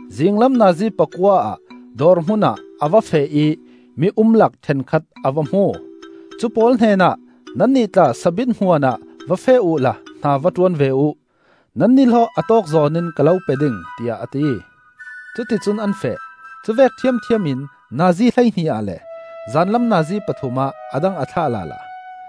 Zinglam nazi pakua ah dawr hmunah a va feh ih mi-umlak ṭhenkhat a va hmu. Cupawl hnenah, ‘Nannih tla sabit hmuanah va feh uhla hna va ṭuan ve uh; nan nihlawh a tawkzawn in ka lo pe ding,’ tiah a ti. Cuticun an feh. Cuvek ṭhiamṭhiam in nazi hleihnih ah le zanlam nazi pathum ah a dang a thlah lala.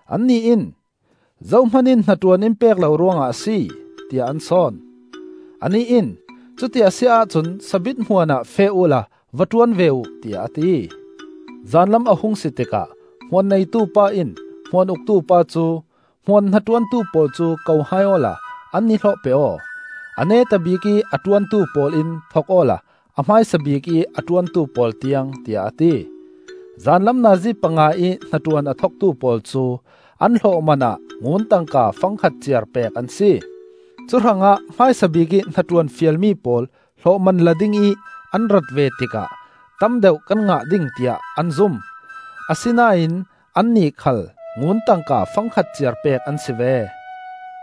Annih in, ‘Zohman in hnaṭuan in pek lo ruangah a si,’ tiah an sawn. Anih in, ‘Cuti a si ahcun sabit hmuan ah feh uhla va ṭuan ve uh,’ tiah a ti. “Zanlam a hung si tikah hmuan neitu pa in hmuan uktu pa cu ‘Hmuan hnaṭuantu pawl cu ko hai awla an nihlawh pe aw, a neta bikih a ṭuantu pawl in thok awla a hmaisa bikih a ṭuantu pawl tiang,’ tiah a ti. Zanlam nazi panga-ih hnaṭuan a thoktu pawl cu an hlawhman ah ngun tangka fangkhat ciar pek an si. Cuhrangah hmaisa bikih hnaṭuan fialmi pawl hlawhman la dingih an rat ve tikah tam deuh kan ngah ding tiah an zum; asinain annih khal ngun tangka fangkhat ciar pek an si ve.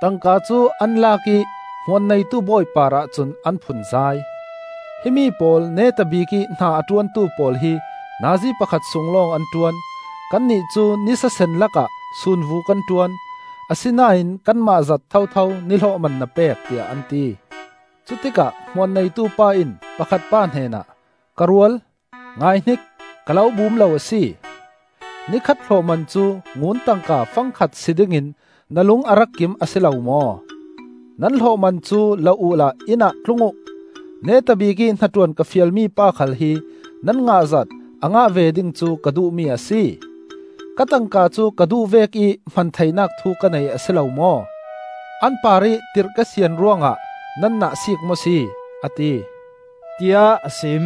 Tangka cu an lak ih hmuan neitu bawi parah cun an phunzai. ‘Himi pawl neta bikih hna a ṭuantu pawl hi nazi pakhat sung lawng an ṭuan; kannih cu nisasen lakah sunvu kan ṭuan, asinain kanmah zat thotho ni hlawhman na pek,’ tiah an ti. “Cutikah hmuan neitupa in pakhat pa hnenah, ‘Ka rual, ngaihnik! Ka lo bum lo a si. Ni khat hlawhman cu ngun tangka fangkhat si dingin na lung a rak kim a si lo maw? Nan hlawhman cu la uhla inn ah tlung uh. Neta bikih hnaṭuan ka fialmi pa khal hi nan ngahzat a ngah ve ding cu ka duhmi a si. Ka tangka cu ka duh vekih hman theinak thu ka nei a si lo maw? An parih tirh ka sian ruangah nan nahsiik maw si?’ a ti,” tiah a sim.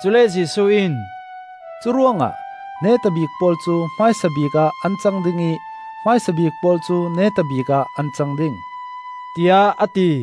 Cule Jesuh in, “Curuangah neta bik pawl cu hmaisabik ah an cang ding ih hmaisa bik pawl cu neta bikah an cang ding,” tiah a ti.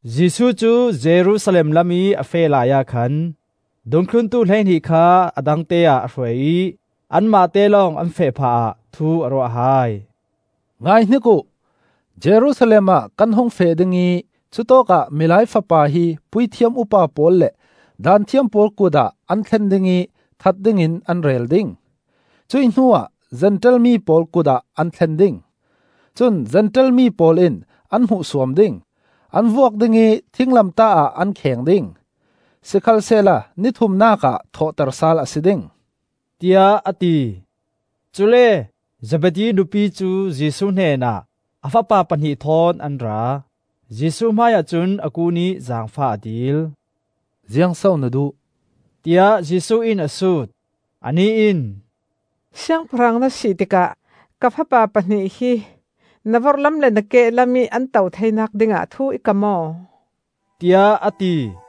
Jesuh cu Jerusalem lamih a feh laiah khan dungthluntu hleihnih kha a dangte ah a hruai ih an mahte lawng, an feh phah ah, thu a ruah hai. “Ngaihnik uh! Jerusalem ah kan hung feh ding ih cutawkah Milai Fapa hi puithiam upa pawl le Daanthiam pawl kut ah an thlen ding ih that dingin an rel ding. Cuih hnuah Zentail mi pawl kut ah an thlen ding. Cun Zentail mi pawl in an hmuhsuam ding, an vuak ding ih thinglamtah ah an kheng ding. Sikhalsehla ni thumnak ah thawhter sal a si ding,” tiah a ti. Cule Zebedi nupi cu Jesuh hnenah a fapa pahnih thawn an ra; Jesuh hmaiah cun a kun ih zaangfah a dil. “Ziang so na duh?” tiah Jesuh in a sut. Anih in, “Siangpahrang na si tikah ka fapa pahnih hi na vorhlam le na kehlamih an to theinak dingah thu i kam aw,” tiah a ti.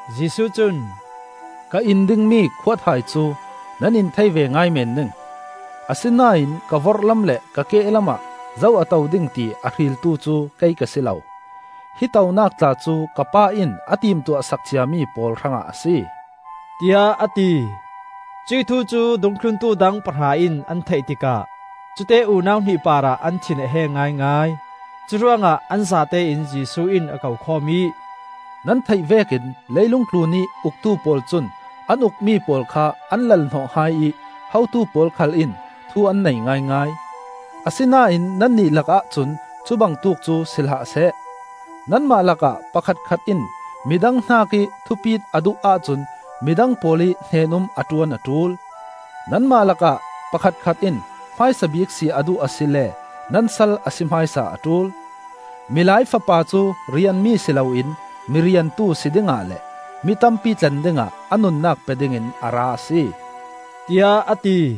Jesuh cun, “Ka in dingmi khuathai cu nan in thei ve ngai men ding. Asinain ka vorhlam le ka kehlam ah zo a to ding ti a hriltu cu kei ka si lo. Hi tonak tla cu ka Pa in a timtuah sak ciami pawl hrangah a si,” tiah a ti. Cuih thu cu dungthluntu dang pahra in an theih tikah cute unau hnih parah an thin a heng ngaingai. Curuangah an zatein Jesuh in a ko khawm ih, “Nan theih vekin leilung tlunih uktu pawl cun an ukmi pawl kha an lal-hnawh hai ih hotu pawl khal in thu an nei ngaingai. Asinain nannih lakah cun cu bangtuk cu si hlah seh. Nanmah lakah pakhatkhat in mi dang hnakih thupit a duh ahcun midang pawl ih hnen-um a ṭuan a ṭul; nanmah lakah pakhatkhat in hmaisa bik si a duh asile nan sal a si hmaisa a ṭul. Milai Fapa cu rianmi si loin mi riantu si dingah le mi tampi tlen dingah a nunnak pe dingin a ra a si,” tiah a ti.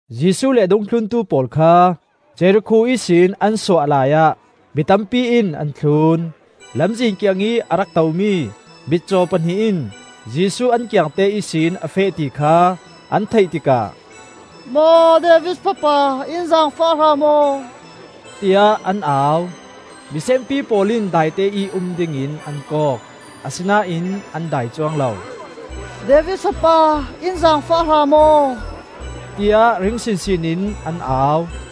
Jesuh le a dungthluntu pawl kha Jerikho ihsin an suah laiah mi tampi in an thlun. Lamzin kiangih a rak tomi mitcaw pahnih in Jesuh an kiangte ihsin a feh ti kha an theih tikah, “Maw David fapa, in zaangfah hram aw,” tiah an au. Mi senpi pawl in daiteih um dingin an kawk. Asinain an dai cuang lo. “David fapa, in zaangfah hramhram aw,” tiah ring sinsin in an au.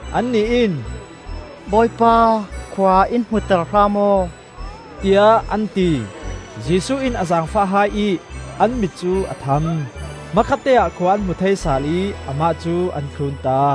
Annih in, “Bawipa, khua in hmuter hram aw,” tiah an ti. Jesuh in a zaangfah hai ih an mit cu a tham. Hmakhatteah khua an hmu thei sal ih amah cu an thlunta.